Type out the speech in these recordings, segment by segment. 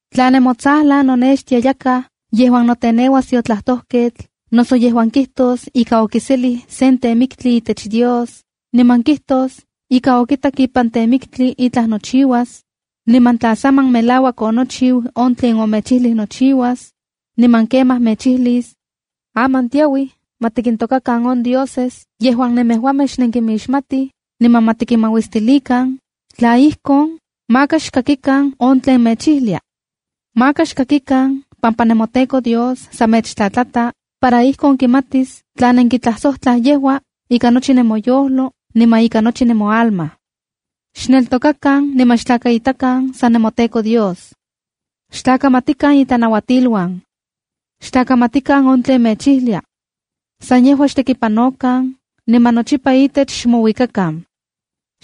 ’Tla nemotsajlan nonextia yakaj yejuan noteneuas tiotlajtojketl noso yejuan kijtos ika okiselij sen temiktli itech Dios, niman kijtos ika okitak ipan temiktli itlaj nochiuas, niman tla saman melauak onochiu on tlen omechijlij nochiuas, niman kemaj mechijlis: ‘Aman tiauij ma tikintokakan on dioses yejuan nemejuamej xnenkinmixmatij, niman ma tikinmauistilikan,’ tla ijkon, maka xkakikan on tlen mechijlia. Maka xkakikan pampa nemoTEKO Dios san mechtlatlata, para ijkon kimatis tla nenkitlajsojtlaj yejua, ika nochi nemoyojlo niman ika nochi nemoalma. Xneltokakan niman xtlakaitakan san nemoTEKO Dios. Xtlakamatikan itlanauatiluan. Xtlakamatikan on tlen mechijlia. San yejua xtekipanokan niman nochipa itech xmouikakan.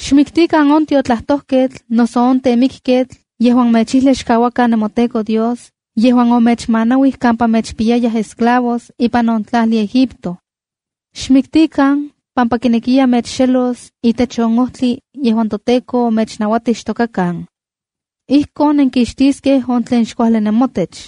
Xmiktikan on tiotlajtojketl noso on temikketl yejuan mechijlia xkauakan nemoTEKO Dios yejuan omechmanauij kampa mechpiyayaj esclavos ipan on tlajli Egipto. Xmiktikan pampa kinekiya mechxelos itech on ojtli yejuan toTEKO omechnauatij xtokakan. Ijkon nenkixtiskej on tlen xkuajli nemotech.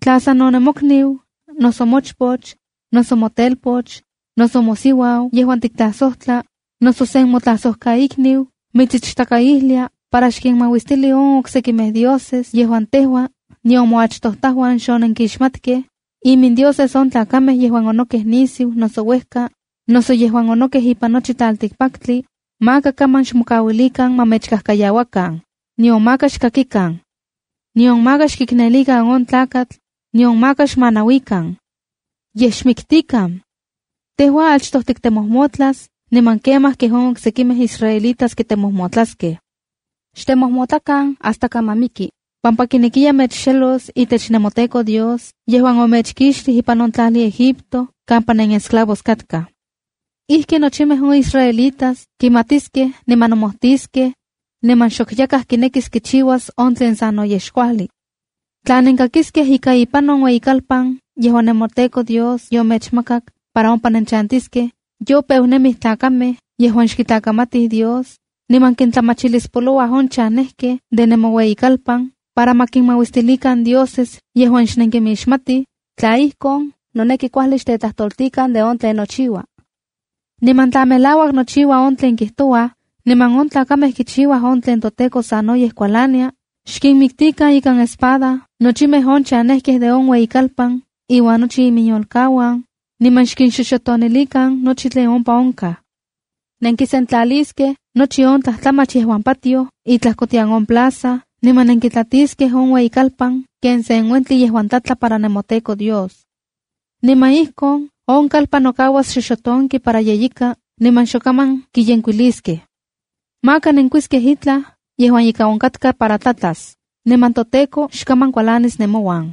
’Tla sano mokniu, noso mochpoch, noso motelpoch, noso mosiuau yejuan tiktlajsojtla, noso sen motlajsojkaikniu mitsichtakaijlia para xkinmauistili on oksekimej dioses yejuan tejua nion moachtojtajuan xonenkimixmatkej, imindioses on tlakamej yejuan onokej nisiu, noso uejka, noso yejuan onokej ipan nochi tlaltikpaktli, maka kaman xmokauilikan ma mechkajkayauakan, nion maka xkakikan. Nion maka xkiknelikan on tlakatl, nion maka xmanauikan. Yej xmiktikan. Tejua achtoj tiktemojmotlas, niman kemaj kej on oksekimej israelitas kitemojmotlaskej. Xtemojmotlakan hasta kaman miki, pampa kinekiya mechxelos itech nemoTEKO Dios yejuan omechkixtij ipan on tlajli Egipto kampa nenesclavos katkaj. Ijki nochimej on israelitas kimatiskej niman nomojtiskej, niman xok yakaj kinekis kichiuas on tlen sanoyej xkuajli. ’Tla nenkakiskej ika ipan sen ueyikalpan yejuan nemoTEKO Dios yomechmakak para ompa nenchantiskej, yopeu nemij tlakamej yejuan xkitlakamatij Dios, niman kintlamachilispolouaj on chanejkej de nemoueyikalpan para ma kinmauistilikan dioses yejuan xnenkimixmatij, tla ijkon, noneki kuajli xtetlaltoltikan de on tlen nochiua. Niman tla melauak nochiua on tlen kijtouaj, niman on tlakamej kichiuaj on tlen toTEKO sanoyej kualania, xkinmiktikan ikan espada nochimej on chanejkej de on ueyikalpan iuan nochi iminyolkauan, niman xkinxoxotonilikan nochi on tlen ompa onkaj. Nenkisentlaliskej nochi on tlajtlamach yejuan patioj itlajkotian on plaza, niman nenkitlatiskej on ueyikalpan ken sen uentli yejuan tlatla para nemoTEKO Dios. Niman ijkon, on kalpan nokauas xoxotonki para yeyika niman xokaman kiyenkuiliskej. ’Maka nenkuiskej itlaj yejuan ye ika onkatka para tlatlas, niman toTEKO xkaman kualanis nemouan.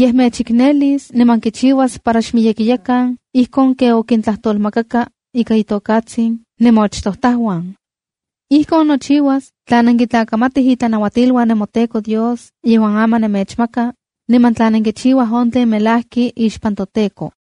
Yej mechiknelis niman kichiuas para xmiyekiyakan ijkon ken okintlajtolmakaka ika itokatsin nemoachtojtajuan. Ijkon nochiuas tla nenkitlakamatij itlanauatiluan nemoTEKO Dios yejuan aman nemechmaka, niman tla nenkichiuaj on tlen melajki ixpan toTEKO.